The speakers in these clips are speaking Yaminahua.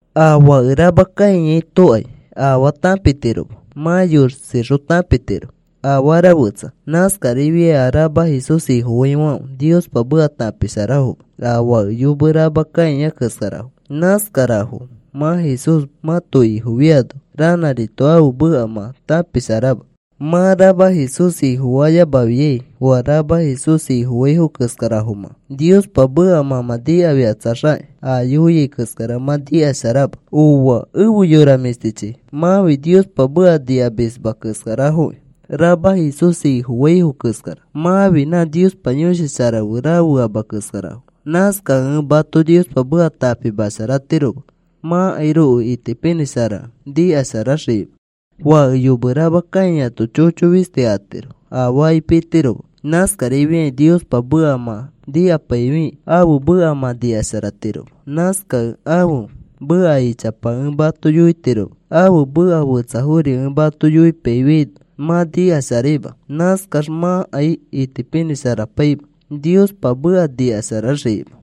A fake rama kãiatokai afaa tãpitiroma. Mã yosixõ tãpitiro afara fetsa. Nãskarifiai a rama Jesús Ifofaifãfe Niospa meka tãpisharafoma a fake yome rama kãia keskarafo. Nãskarafo mã Jesús mãto Ifo fiano ranãrito ãfe meka mã tãpisharama. Mã rama Jesús Ifofayamafiai oa rama Jesús Ifofaifo keskarafo, mã. Niospa meka mã mã nikafikatsaxakĩ a yoiai keskara mã nikasharama. Ooa efe yora mĩshtichi, mãfi Niospa meka nikamisma keskarafoki, rama Jesús Ifofaifo keskara. Mãfi nã Niospa Yõshi Shara fe rafeama keskarafo. Nãskakẽ ẽ mato Niospa meka tãpimasharatiroma mãkairoko itipinĩsharakẽ nikasharaxikima. Fake yome rama kãiato chocho fisti atiro, afaakai pitiroma. Nãskarifiakĩ Niospa meka mã nikapaifikĩ ãfe meka mã nikasharatiroma. Nãskakẽ ãfe meka ichapa ẽ mato yoiyotiroma. Ãfe meka fetsafori ẽ mato yoipaifiaino mã nikasharaima. Nãskax mãkai itipinĩsharapaima Niospa meka nikasharaxikima.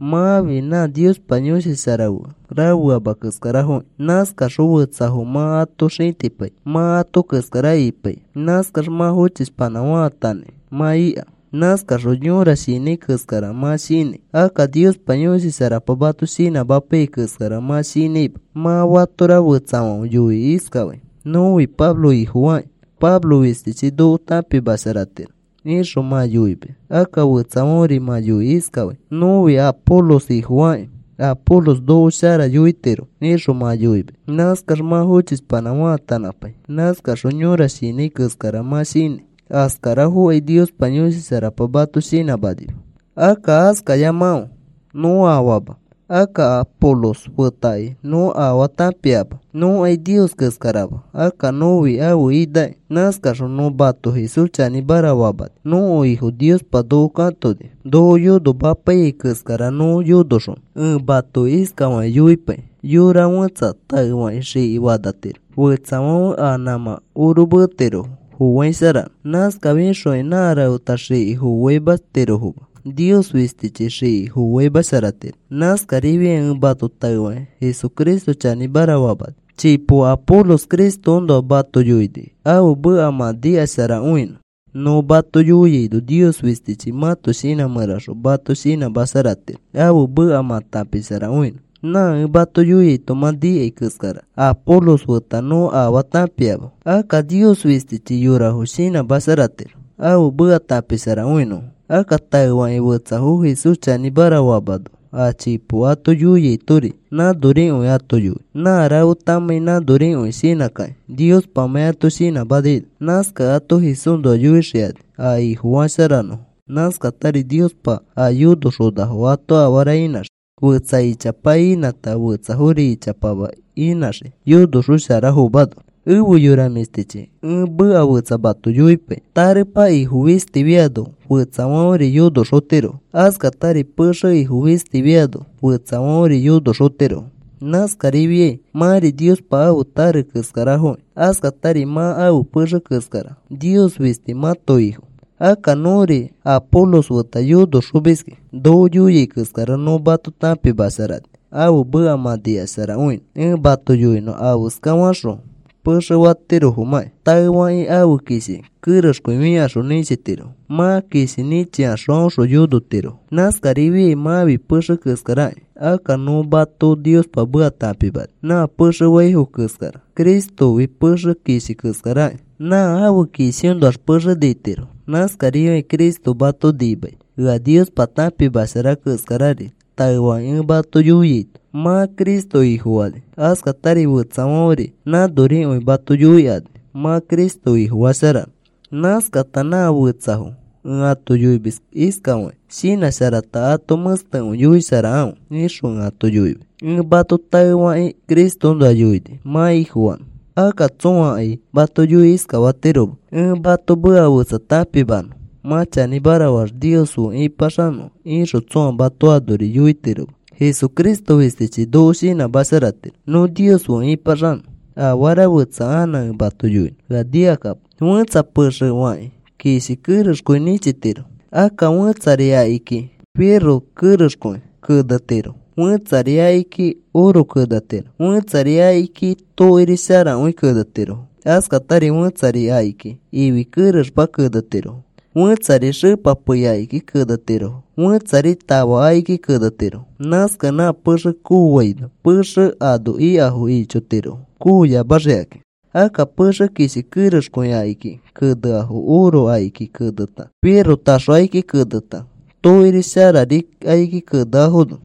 Mãfi nã Niospa Yõshi Shara fe rafeama keskarafokĩ. Nãskaxõ fetsafo mã ato xĩtipai mã ato keskara ipaikĩ. Nãskax mã fochishpanã faatanãi mã ika. Nãskaxõ yõra shinãi keskara mã shinãi. Akka Niospa Yõshi Sharapa mato shinãmapaiyai keskara mã shinãima. Mã fatora fetsafãfe yoikĩ iskafai: “Nõfi Pablo ifofakĩ. Pablo fistichi noko tãpimasharatiro,” ixõ mã yoimis. Akka fetsafãferi mã yoikĩ iskafai: “Nõfi Apolos ifofakĩ. Apolos noko shara yoitiro,” ixõ mã yoimis. Nãskax mã fochishpanã faatanãpai. Nãskaxõ yõra shinãi keskara mã shinãi. Askarafokai Niospa Yõshi Sharapa mato shinãmanima. Akka askayamakãfe. Nõ afaama. Akka Apolos fetakai nõ afaa tãpiama. Nõkai Nios keskarama. Akka nõfi ãfe inaki. Nãskaxõ nõ mato Jesús chanĩmara famani. Nõko Ifo Niospa noko katoni noko yonomapaiyai keskara nõ yonoxonõ. Ẽ mato iskafakĩ yoipai. Yora fẽtsa taefakĩ xiki fanatiro. Fetsafãfe a nãmã orometirofo foaisharanõ. Nãskafixokai nã rafeta xiki foaimatirofoma. Nios fistichi xiki foaimasharatiro. Nãskarifiakĩ ẽ mato taefakĩ Jesucristo chanĩmara famani. Chipo Apolos Cristoõnoa mato yoini ãfe meka mã nikasharakõinõ. Nõ mato yoiaino Nios fistichi mãto shinã mẽraxõ mato shinãmasharatiro ãfe meka mã tãpisharakõinõ. Nã ẽ mato yoiaito mã nikai keskara Apolos feta nõ afaa tãpiama. Akka Nios fistichi yorafo shinãmasharatiro ãfe meka tãpisharakõinõfo. Akka taefakĩ fetsafo Jesús chanĩmara famano, a chipo ato yoiaitori nãnorikõiri ato yoi. Nã rafetamãi nãnorikõi shinãkakĩ Niospamãi ato shinãmanaino. Nãskakẽ ato Jesúsnoa yoixikani a Ifofasharanõfo. Nãskatari Niospa a yonoxonafo ato afara inãxii. Fetsa ichapa inãta fetsafori ichapama inãxii yonoxosharafomano. Efe yora mĩshtichi, ẽ meka fetsa mato yoipai. Tarepa ifo fistifiano fetsafãferi yonoxotirofo. Askatari pexe ifo fistifiano fetsafãferi yonoxotirofo. Nãskarifiai mãfi Niospa ãfe tare keskarafokĩ. Askatari mã ãfe pexe keskara. Nios fisti mãto Ifo. Akka nõri Apolos feta yonoxomiski. Noko yoiai keskara nõ mato tãpimasharani ãfe meka mã nikasharakõinõ. Ẽ mato yoinõ afeska faxõ pexe fatirofomãki. Taefakĩ ãfe kishi kerexkõi fikaxõ nĩchitirofo. Mã kishi nĩchikaxõ aõxõ yonotirofo. Nãskarifiai mãfi pexe keskaraki. Akka nõ mato Niospa meka tãpimani nã pexe faifo keskara. Cristofi pexe kishi keskaraki. Nã ãfe kishiõnoax pexe nitiro. Nãskarifiakĩ Cristo mato nimai. Ea Niospa tãpimashara keskarari taefakĩ ẽ mato yoiaito mã Cristo Ifofani. Askatari fetsafãferi nãnorikõi mato yoikani mã Cristo Ifofasharanõ. Nãskata nã fetsafo ẽ ato yoimis iskafakĩ: “Shinãsharata ato mẽstekõi yoisharakãfe,” ixõ ẽ ato yoimis. Ẽ mato taefakĩ Cristoõnoa yoini mã Ifofanõ. Akka tsõakai mato yoikĩ iskafatiroma: “Ẽ mato meka fetsa tãpimanõ mã chanĩmara faax Nios fe ĩpaxanõ,” ixõ tsõa mato anori yoitiroma. Jesucristo fistichi noko nimasharatiro nõ Nios fe ĩpaxanõ. Afara fetsa anã ẽ mato yoinõ, ea nikakapo. Fẽtsa pexe fakĩ kishi kerexkõi nĩchitiro. Akka fẽtsari akiki rofetaxõ kerexkõi kenetirofo. Fẽtsari akiki oro kenetiro. Fẽtsari akiki tokiri sharakõi kenetirofo. Askatari fẽtsari akiki ifi kerexma kenetirofo. Fẽtsari xepa pei akiki kenetirofo. Fẽtsari tafa akiki kenetiro. Nãskakẽ nã pexe kooaino pexe ano ikafo ichotirofo kooyamaxikakĩ. Akka pexe kishi kerexkõi akiki keneafo oro akiki keneta, roe taxo akiki keneta, tokiri sharari akiki keneafono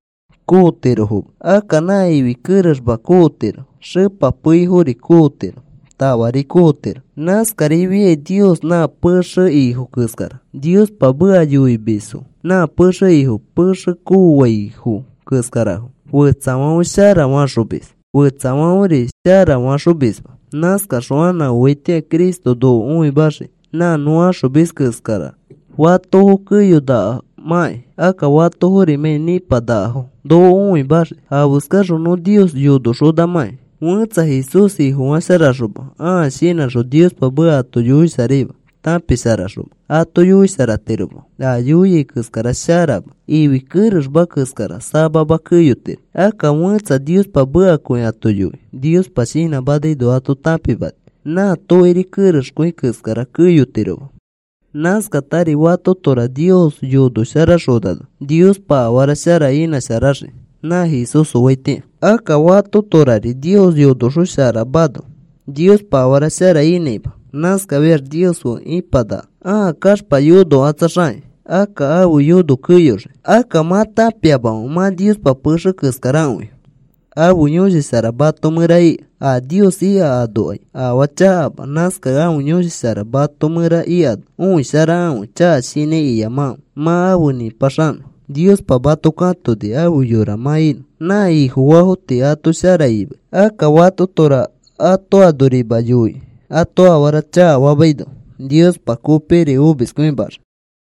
kootirofoma. Akka nã ifi kerexma kootiro. Xepa peifori kootiro. Tafari kootiro. Nãskarifiai Nios nã pẽxe ifo keskara. Niospa meka yoimisfo nã pexe ifo pexe faxõaifo keskarafo. Fetsafãfe shara faxomis, fetsafãferi shara faxomisma. Nãskaxõ anã oaitĩa Cristo noko õimaxii nã nõ axomis keskara fatofo keyonakamakĩ. Akka fatofori nipanakafomãkĩ. Noko õimaxii afeskaxõ nõ Nios yonoxonamãki. Fẽtsa Jesús Ifofasharaxoma ãa shinãxõ Niospa meka ato yoisharaima, tãpisharaxoma ato yoisharatiroma. A yoiai keskara sharama, ifi kerexma keskara, samama keyotiro. Akka fẽtsa Niospa mekakõi ato yoi. Niospa shinãmanaino ato tãpimani. Nã tokiri kerexkõi keskara keyotiroma. Nãskatari fatotora Nios yonosharaxonano Niospa afara shara inãsharaxii nã Jesús oaitĩa. Akka fatotorari Nios yonosharaxonamano Niospa afara shara inãima. Nãskafiax Nios fe ipanaka. Ãa kaxpa yonokatsaxakĩ akka ãfe yono keyoxii. Akka, ¿mã tãpiamamẽ mã Niospa pexe keskarakõi? Ãfe Yõshi Shara mato mẽra ika. A Nios ika anokai afaa chakama. Nãskakẽ ãfe Yõshi Shara mato mẽra ikano õisharakãfe chaka shinãi iyamakãfe. Mã afe nĩpaxanõ Niospa mato katoni afe yora mã inõ. Nã Ifofaafo tii ato shara imai. Akka fatotora ato anorima yoikĩ ato afara chakafamaino Niospa kopikiri omiskõimaxii.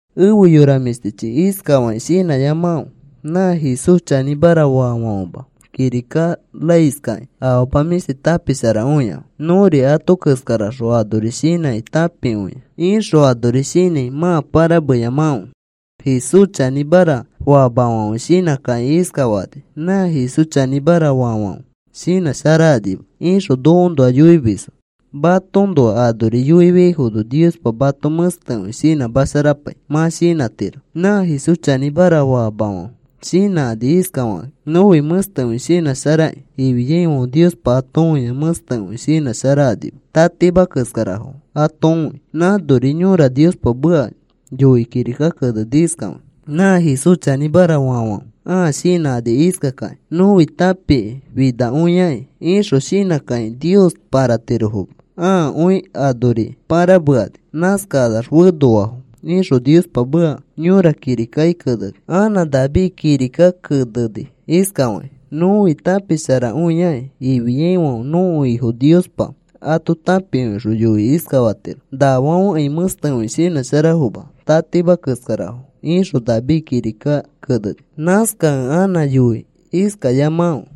Efe yora mĩshtichi, iskafakĩ shinãyamakãfe: “Nã Jesús chanĩmara famafãfe kirika raiskakĩ afama mĩshti tãpisharakõiafo. Nõri ato keskaraxõ anori shinãkĩ tãpikõia,” ixõ anori shinãi mã pãrameyamakãfe. Jesús chanĩmara famafãfe shinãkakĩ iskafakani: “Nã Jesús chanĩmara faafãfe shinãsharakanima,” ixõ nokoõnoa yoimisfo. Matoõnoa anori yoifiaifono Niospa mato mẽstekõi shinãmasharapai mã shinãtiro. Nã Jesús chanĩmara famafãfe shinãkani iskafakakĩ: “Nõfi mẽstekõi shinãsharakĩ,” ifiaifãfe Niospa ato õia mẽstekõi shinãsharakanima. Tatima keskarafo ato õi. Nãnori yõra Niospa meka yoikĩ kirika keneni iskafakĩ: “Nã Jesús chanĩmara famafãfe ãa shinãkani iskakakĩ: ‘Nõfi tãpikĩ finakõiaki,’ ixõ shinãkakĩ Nios pãratirofoma. Ãakõi anori pãramekani. Nãskakanax fenoafo,” ixõ Niospa meka yõra kirikaki keneni. Anã David kirika keneni iskafakĩ: “ ‘Nõfi tãpisharakõiaki,’ ifiaifãfe nõko Ifo Niospa ato tãpikõixõ yoikĩ iskafatiro: ‘Nafãfekai mẽstekõi shinãsharafoma, tatima keskarafo,’” ixõ David kirika keneni. Nãskakẽ anã yoi iskayamakãfe: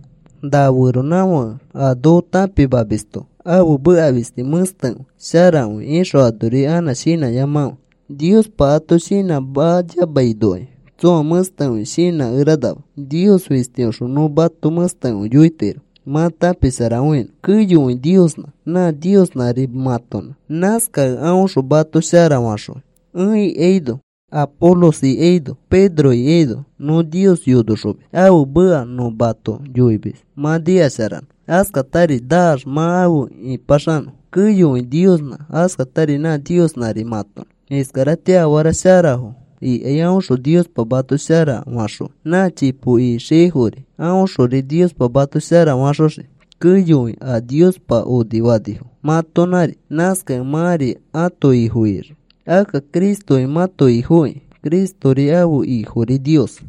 “Na feronãfãke a noko tãpimamisto ãfe meka fisti mẽstekõi, sharakõi,” ixõ anori anã shinãyamakãfe. Niospa ato shinãmayamainokai tsõa mẽstekõi shinãkeranama. Nios fistioxõ nõ mato mẽstekõi yoitiro mã tãpisharakõinõ. Keyokõi Niosnã, nã Niosnãri mãtonã. Nãskakẽ aõxõ mato shara faxõi. Ẽ ikaino, Apolos ikaino, Pedro ikaino nõ Nios yonoxomis. Ãfe meka nõ mato yoimis mã nikasharanõ. Askatari naax mã afe ĩpaxanõ. Keyokõi Niosnã, askatari nã Niosnãri mãtonã. Iskaratĩa afara sharafo ikai aõxõ Niospa mato shara faxõi. Nã chipo ixiaifori aõxori Niospa mato shara faxoxii. Keyokõi a Niospa onifanifo mãtonãri. Nãskakẽ mãri ãto ifo ixii. Akka Cristofi mãto Ifokĩ. Cristori ãfe Ifori Nios.